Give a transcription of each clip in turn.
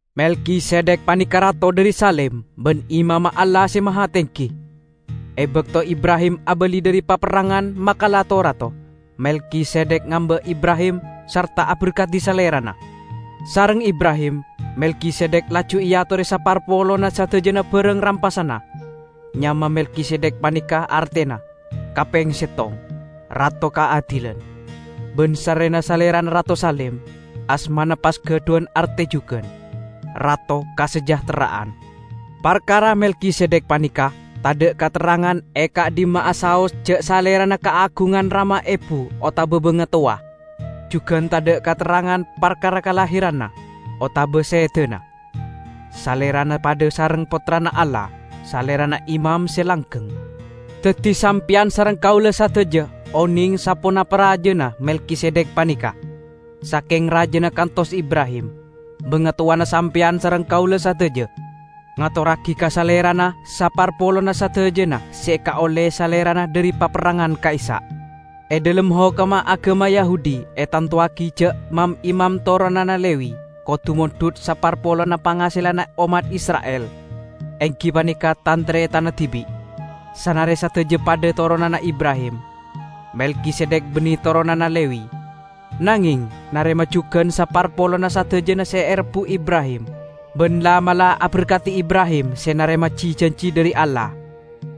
Melkisedek paneka rato dhari Salem ban imamma Allah Se Mahatenggi. E bakto Ibrahim abali dhari paperrangan makala to-rato, Melkisedek ngamba' Ibrahim sarta aberkadi salerana. Sareng Ibrahim Melkisedek laju eatore saparpolonna sadajana barang rampasanna. (Nyama Melkisedek paneka artena, kapeng settong, "Rato Kaadilan"; ban sarrena salerana rato Salem, asmana pas gadhuwan arte jugan "Rato Kasajahtera'an".) Parkara Melkisedek paneka tadha' katerrangan e ka'dhimma'a saos ja' salerana kaagungan rama ebu otaba bangatowa; jugan tadha' katerrangan parkara kalahiranna, otaba sedana. Salerana padha sareng Pottrana Allah; salerana imam se langgeng. Daddi sampeyan sareng kaula sadaja oneng saponapa rajana Melkisedek paneka; sakeng rajana kantos Ibrahim, bangatowana sampeyan sareng kaula sadaja, ngatorragi ka salerana saparpolonna sadajana se ekaolle salerana dhari paperrangan ka'issa'. E dhalem hokomma agama Yahudi etantowagi ja' mam-imam toronanna Lewi kodu mondhut saparpolonna pangaselanna ommat Isra'il, enggi paneka tan-taretanna dibi', sanare sadaja padha toronanna Ibrahim. Melkisedek banne toronanna Lewi, nangeng narema jugan saparpolonna sadajana se erebbu' Ibrahim, ban la'-mala' aberkadi Ibrahim se narema ji-janji dhari Allah.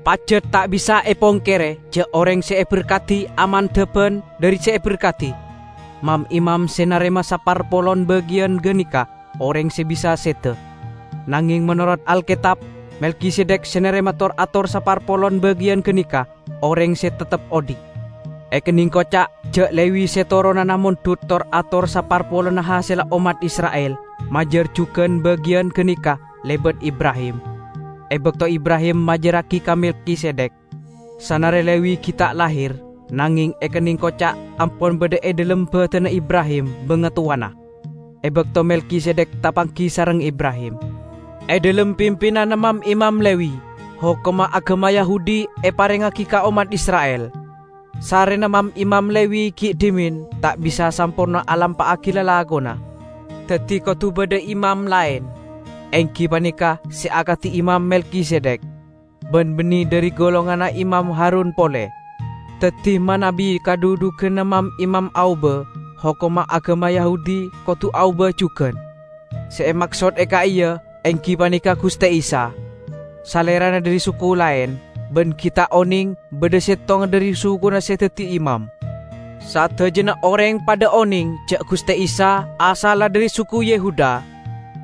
Pajat ta' bisa epongkere ja' oreng se eberkadi amandhaban dhari se aberkadi. Mam-imam se narema saparpolon bagiyan ganeka oreng se bisa seda. Nangeng menorot Alketab, Melkisedek se narema tor-ator saparpolon bagiyan ganeka oreng se teptep odhi'. Ekenneng koca', ja' Lewi -- se toronanna mondhut tor-ator saparpolonna hasella ommat Isra'il -- majar jugan bagiyan ganeka lebat Ibrahim, e bakto Ibrahim majarragi ka Melkisedek. Sanare Lewi gi' ta' lahir, nangeng ekenneng koca' ampon badha e dhalem badanna Ibrahim bangatowana, e bakto Melkisedek tapanggi sareng Ibrahim. E dhalem pimpinanna mam-imam Lewi, hokomma agama Yahudi eparengngagi ka ommat Isra'il. Sarrena mam-imam Lewi gi' dhimen ta' bisa samporna alampa'agi lalakonna, daddi kodu badha imam laen, enggi paneka se akadi Imam Melkisedek, ban banne dhari golonganna Imam Harun pole! Daddi, manabi kadhudhuganna mam-imam aoba, hokomma agama Yahudi kodu aoba jugan. Se emaksod e ka'iya enggi paneka Guste Isa: Salerana dhari suku laen, ban gi' ta' oneng badha settonga dhari sukuna se daddi imam. Sadajana oreng padha oneng ja' Guste Isa asalla dhari suku Yehuda;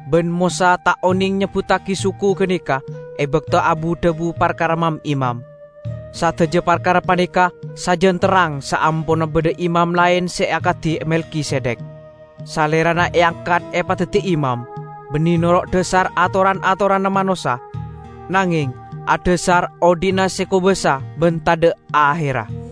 ban Mosa ta' oneng nyebbuttagi suku ganeka e bakto abu-dhabu parkara mam-imam. Sadaja parkara paneka sajan terrang saamponna badha imam laen se akadi Melkisedek. Salerana eangkat epadaddi imam, banne noro' dhasar atoran-atoranna manossa, nangeng adhasar odhi'na se kobasa ban tadha' aherra.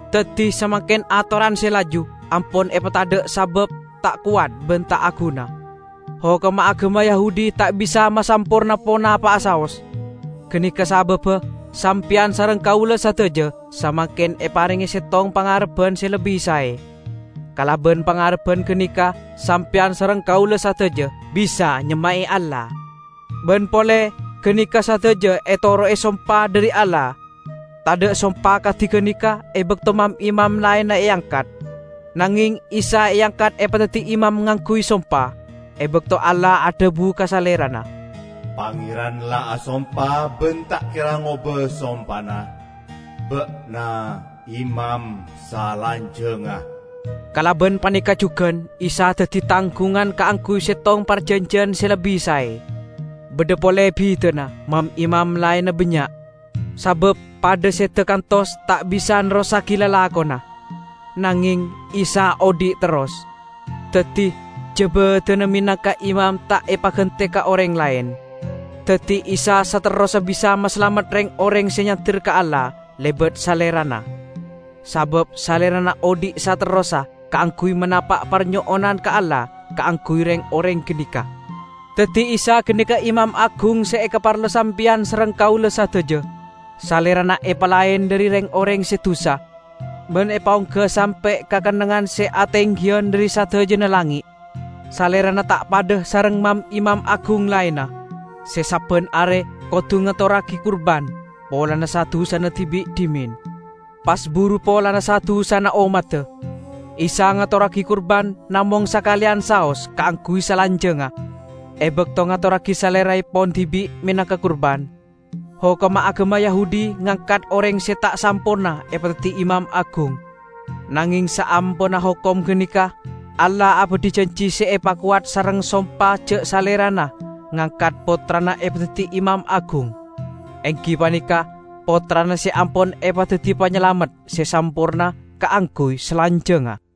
Daddi, samangken atoran se laju ampon epatadha' sabab ta' kowat ban ta' aguna. Hokomma agama Yahudi ta' bisa masamporna ponapa'a saos. Ganeka sababba sampeyan sareng kaula sadaja samangken eparenge settong pangarebban se lebbi sae; kalaban pangarebban ganeka sampeyan sareng kaula sadaja bisa nyemma'e Allah. Ban pole, ganeka sadaja etoro'e sompa dhari Allah. Tadha' sompa kadi ganeka e bakto mam-imam laenna eangkat. Nangeng Isa eangkat epadaddi imam ngangguy sompa, e bakto Allah adhabu ka Salerana, "Pangeran la asompa ban ta' kera ngoba sompana, 'Ba'na imam salanjangnga.' " Kalaban paneka jugan Isa daddi tanggungan kaangguy settong parjanjiyan se lebbi sae. Badha pole bidana: mam-imam laenna bannya', sabab padha seda kantos ta' bisa nerrossagi lalakonna. Nangeng Isa odhi' terros, daddi jabadanna menangka imam ta' epagante ka oreng laen. Daddi Isa saterrossa bisa masalamet reng-oreng se nyander ka Allah lebat Salerana, sabab Salerana odhi' saterrossa kaangguy manapa' parnyo'onan ka Allah kaangguy reng-oreng ganeka. Daddi Isa ganeka Imam Agung se ekaparlo sampeyan sareng kaula sadaja. Salerana epalaen dhari reng-oreng se dusa, ban epaongga sampe' ka kennengngan se atenggiyan dhari sadajana langnge'. Salerana ta' padha sareng mam-imam agung laenna, se sabban are kodu ngatorragi kurban polana sa-dusana dibi' dhimen, pas buru polana sa-dusana ommadda. Isa ngatorragi kurban namong sakaleyan saos kaangguy salanjangnga, e bakto ngatorragi saleraepon dibi' menangka kurban. Hokomma agama Yahudi ngangkat oreng se ta' samporna epadaddi imam agung. Nangeng saamponna hokom ganeka, Allah abadhi janji se epakowat sareng sompa ja' Salerana ngangkat Pottrana epadaddi Imam Agung, enggi paneka Pottrana se ampon epadaddi Panyalamet se samporna kaangguy salanjangnga.